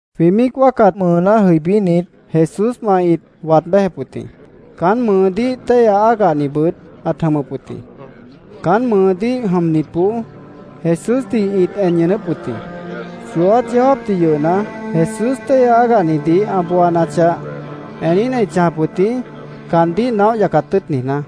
Jwĩ míic wáacat mʉʉná jʉibínit, Jesúswã ĩt waad béjep wʉt jĩ. Caán mʉʉdíh téihya ágahnibʉt ãt jʉmʉp wʉt jĩ. Caán mʉʉdíh jʉmnitboó Jesúsdih ĩt en ñʉʉnʉ́p wʉt jĩ. Chooát yeó jáapdih yʉhna, Jesús téihya ágahnidih ã booanachah, eníhna ĩt chãjap wʉt jĩ, caandíh naóh yacat tʉ́ʉt niijná.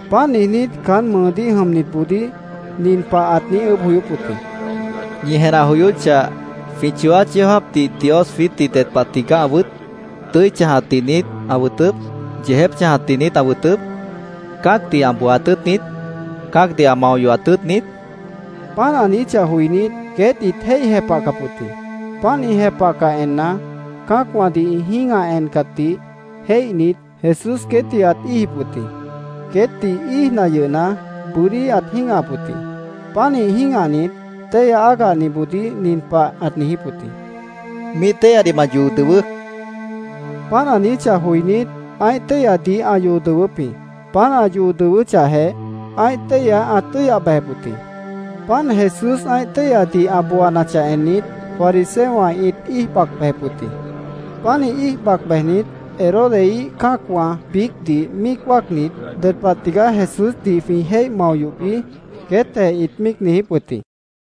Páant niijnít, caán mʉʉdíh jʉmnitboodíh nin pah ãt niíj ʉʉ́bh joyóp wʉt jĩ: —Ñi jenah joyóchah, ¿jwĩ chooát yeó jáapdih Dios jwiítdih ded pah tigaá ã wʉt? ¿Tʉ́i chãjatdih niít ã wʉtʉp? ¿Yeejép chãjatdih niít ã wʉtʉp? ¿Cã́acdih ã booaat tʉ́ʉt niít? ¿Cã́acdih ã mao yohat tʉ́ʉt niít? queétdih ãt niijíp wʉt jĩ. Páant ã niijíchah joinít, queét ĩt jéih jepahcap wʉt jĩ. Páant ĩ jepahcah enna, cã́acwãdih ĩ jĩ́gah encatdih jéihnit, Jesús queétdih ãt íijip wʉt jĩ. Queétdih íijna yʉhna, bʉ́dí ãt jĩ́gahap wʉt jĩ. Pánih jĩ́gahnit, téihya ágahniboodíh nin pah ãt niijíp wʉt jĩ: —Míih téihyadih ma yoo dʉwʉʉ́, ãt niijíp wʉt jĩ. Páant ã niijíchah joinít, ã́ih téihyadih ãt yoo dʉwʉ́p wʉt jĩ. Páant ã yoo dʉwʉ́chahjeh, ã́ih téihya ãt tʉ́yah bejep wʉt jĩ. Páant Jesús ã́ih téihyadih ã booanachah ennit, fariseowã ĩt íij bac bejep wʉt jĩ. Pánih íij bac bejnit, Herodeíh cã́acwã biícdih míic wáacnit, “¿Ded pah tigaá Jesúsdih jwĩ jéih mao yohbi?” queétjeh ĩt míic niijíp wʉt jĩ.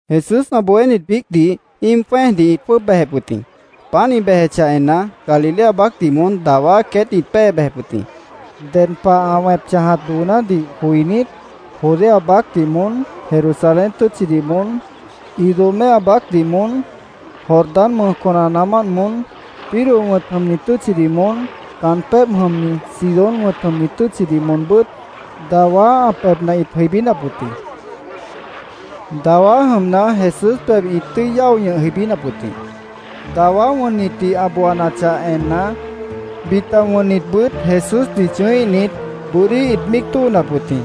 Jesús ã bohénit biícdih íim jwẽ́ejdih ĩt jwʉ́ʉb bejep wʉt jĩ. Páant ĩ bejechah enna, Galilea baácdih moón dawá queétdih ĩt pée bejep wʉt jĩ. Ded pah ã wẽp chãjat doonádih joinít, Judea baácdih moón, Jerusalén tʉ́tchidih moón, Idumea baácdih moón, Jordán mʉj conanaamánt moón, Tiro wʉ̃t jʉmni tʉ́tchidih moón, caan pébh jʉmni Sidón wʉ̃t jʉmni tʉ́tchidih moonbʉ́t dawá ã pebhna ĩt jʉibínap wʉt jĩ. Dawá jʉmna, Jesús pebh ĩt tʉ́i yáo ñʉh jʉibínap wʉt jĩ. Dawá wʉnnitdih ã booanachah enna, bita wʉnnitbʉt Jesúsdih chʉ̃ʉ́íhnit, bʉ́dí ĩt míic tóonap wʉt jĩ.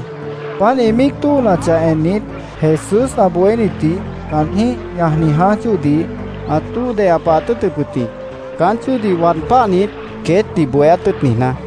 Páant ĩ míic tóonachah ennit, Jesús ã bohénitdih caanjĩ́h ñajni jãáj chóodih ãt tóo deya pahaat tʉ́ʉtʉp wʉt jĩ, caán chóodih waad páhnit, queétdih bohéát tʉ́ʉt niijná.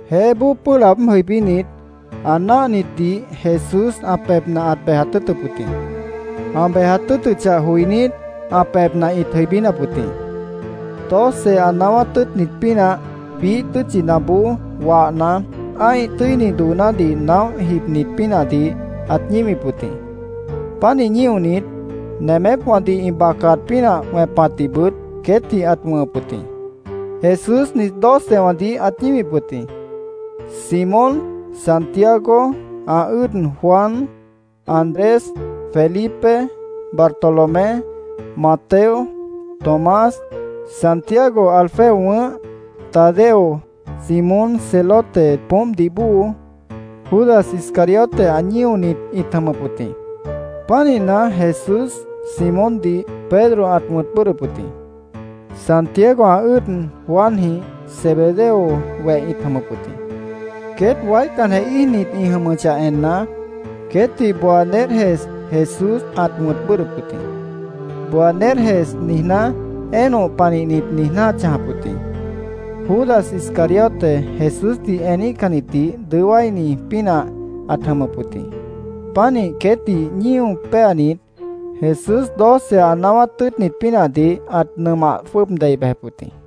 Jeéboó pʉ́ʉh laab jʉibínit, ã náahnitdih Jesús ã pebhna ãt bejat tʉ́ʉtʉp wʉt jĩ. Ã bejat tʉ́ʉtʉchah joinít, ã pebhna ĩt jʉibínap wʉt jĩ. Doce ã naáwát tʉ́ʉtnit pínah biíh tʉ́tchinaboó wahna, ã́ih tʉ́ini doonádih naóh jibnit pínahdih ãt ñíwip wʉt jĩ. Pánih ñíonit, nemépwãdih ĩ bacaat pínah wẽpatdihbʉt queétdih ãt wʉ̃hʉp wʉt jĩ. Jesús nit docewãdih ãt ñíwip wʉt jĩ: Simón, Santiago, ã ʉ́ʉd Juan, Andrés, Felipe, Bartolomé, Mateo, Tomás, Santiago Alfeo wʉ̃ʉ́h, Tadeo, Simón Celote poómpdih bóo, Judas Iscariote ã ñíonit ĩt jʉmʉp wʉt jĩ. Pánihna, Jesús Simóndih Pedro ãt wʉ̃t bʉ́ʉdhdʉp wʉt jĩ. Santiago, ã ʉ́ʉd Juanjĩh Zebedeo weh ĩt jʉmʉp wʉt jĩ. Queét waícanjeh íijnit ĩ jʉmʉchah enna, queétdih Boanerges Jesús ãt wʉ̃t bʉ́ʉdhdʉp wʉt jĩ. “Boanerges” niijná, “Énoh panihnit”, niijná ãt chãjap wʉt jĩ. Judas Iscariote Jesúsdih eníhcannitdih dʉó wáini pínah ãt jʉmʉp wʉt jĩ. Pánih queétdih ñío péanit, Jesús doce ã naáwát tʉ́ʉtnit pínahdih ãt nʉmah jwʉ́ʉb dei bejep wʉt jĩ.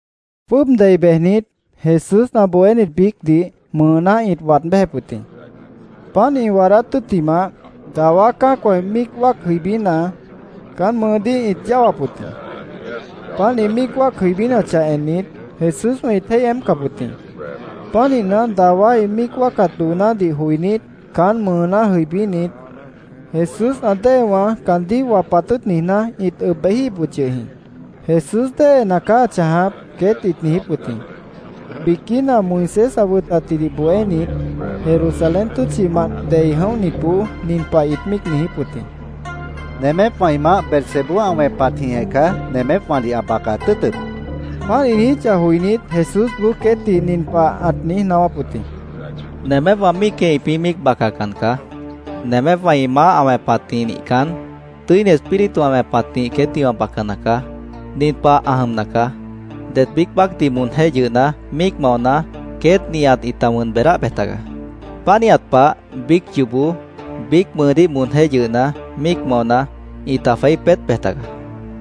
Jwʉ́ʉb dei bejnit, Jesús ã bohénit biícdih mʉʉná ĩt waad béjep wʉt jĩ. Páant ĩ waadát tʉ́ttimah, dawá cã́acwã míic wáac jʉibína, caan mʉʉdíh ĩt yáwap wʉt jĩ. Páant ĩ míic wáac jʉibínachah ennit, Jesúswã ĩt jéih jeémpcap wʉt jĩ. Pánihna, dawá ĩ míic wáacat doonádih joinít, caán mʉʉná jʉibínit, Jesús ã déewã caandíh wapat tʉ́ʉt niijná, ĩt ʉb bejíhip wʉt yʉh jĩ. “Jesús déhena caá ã chãjap”, queét ĩt niijíp wʉt jĩ. Biquína Moisés ã wʉtatjidih bohénit Jerusalén tʉ́tchimant dei jʉibínitboó nin pah ĩt míic niijíp wʉt jĩ: “Nemépwã ĩ maáh Beelzebú ã wẽpatjĩhjeh caá nemépwãdih ã bacat tʉ́ʉtʉp”, ĩt niijíp wʉt jĩ. Páant ĩ niijíchah joinít, Jesúsboó queétdih nin pah ãt niíj naáwáp wʉt jĩ: “Nemépwã míicjeh ĩpĩ́ míic bacacan caá. Nemépwã ĩ maáh ã wẽpatjĩh nihcan, Tʉ́ini Espíritu ã wẽpatjĩh queétdih wã bacana caá. Nin pah ã jʉmna caá: Det biíc baácdih moonjéh yʉhna míic maona, queét nihat ĩta wʉn beedáh bej tagaá. Pánihat pah, biíc yoobó, biíc mʉʉdíh moonjéh yʉhna, míic maona, ĩta jweí peét bej tagaá.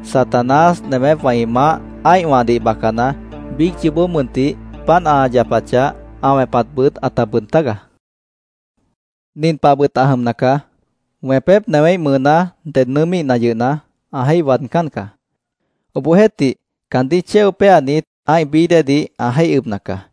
Satanás, nemépwã ĩ maáh ã́ihwãdih bacana, biíc yoobó mʉntih páant ã yapachah, ã wẽpatbʉt ãta bʉʉd tágaá. “Nin pahbʉt ã jʉmna caá: Wẽpép newéíh mʉʉná ded nʉʉ́míhna yʉhna, ã jéih waadcán caá. Obohjeéhtih, caandíh chéo péanit, ã́ih bií déedih ã jéih ʉbna caá.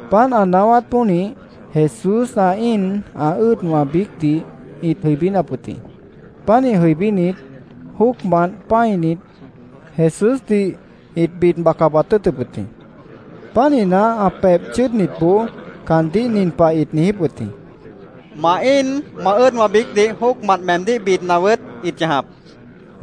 Páant ã naáwát pónih, Jesús ã íin ã ʉ́ʉdwã biícdih ĩt jʉibínap wʉt jĩ. Pánih jʉibínit, jóocmant pã́init, Jesúsdih ĩt bid baca bojat tʉ́ʉtʉp wʉt jĩ. Pánihna, ã pebh chʉ́ʉdnitboó caandíh nin pah ĩt niijíp wʉt jĩ: —Ma íin, ma ʉ́ʉdwã biícdih jóocmant meemdíh bidna wʉʉ́t ĩt chãjap, ĩt niijíp wʉt jĩ.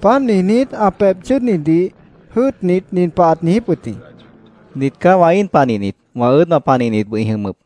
Páant niijnít, ã pebh chʉ́ʉdnitdih jʉ́ʉtnit, nin pah ãt niijíp wʉt jĩ: —Nit caá wã íin panihnit, wã ʉ́ʉdwã panihnitbʉt ĩ jʉmʉp.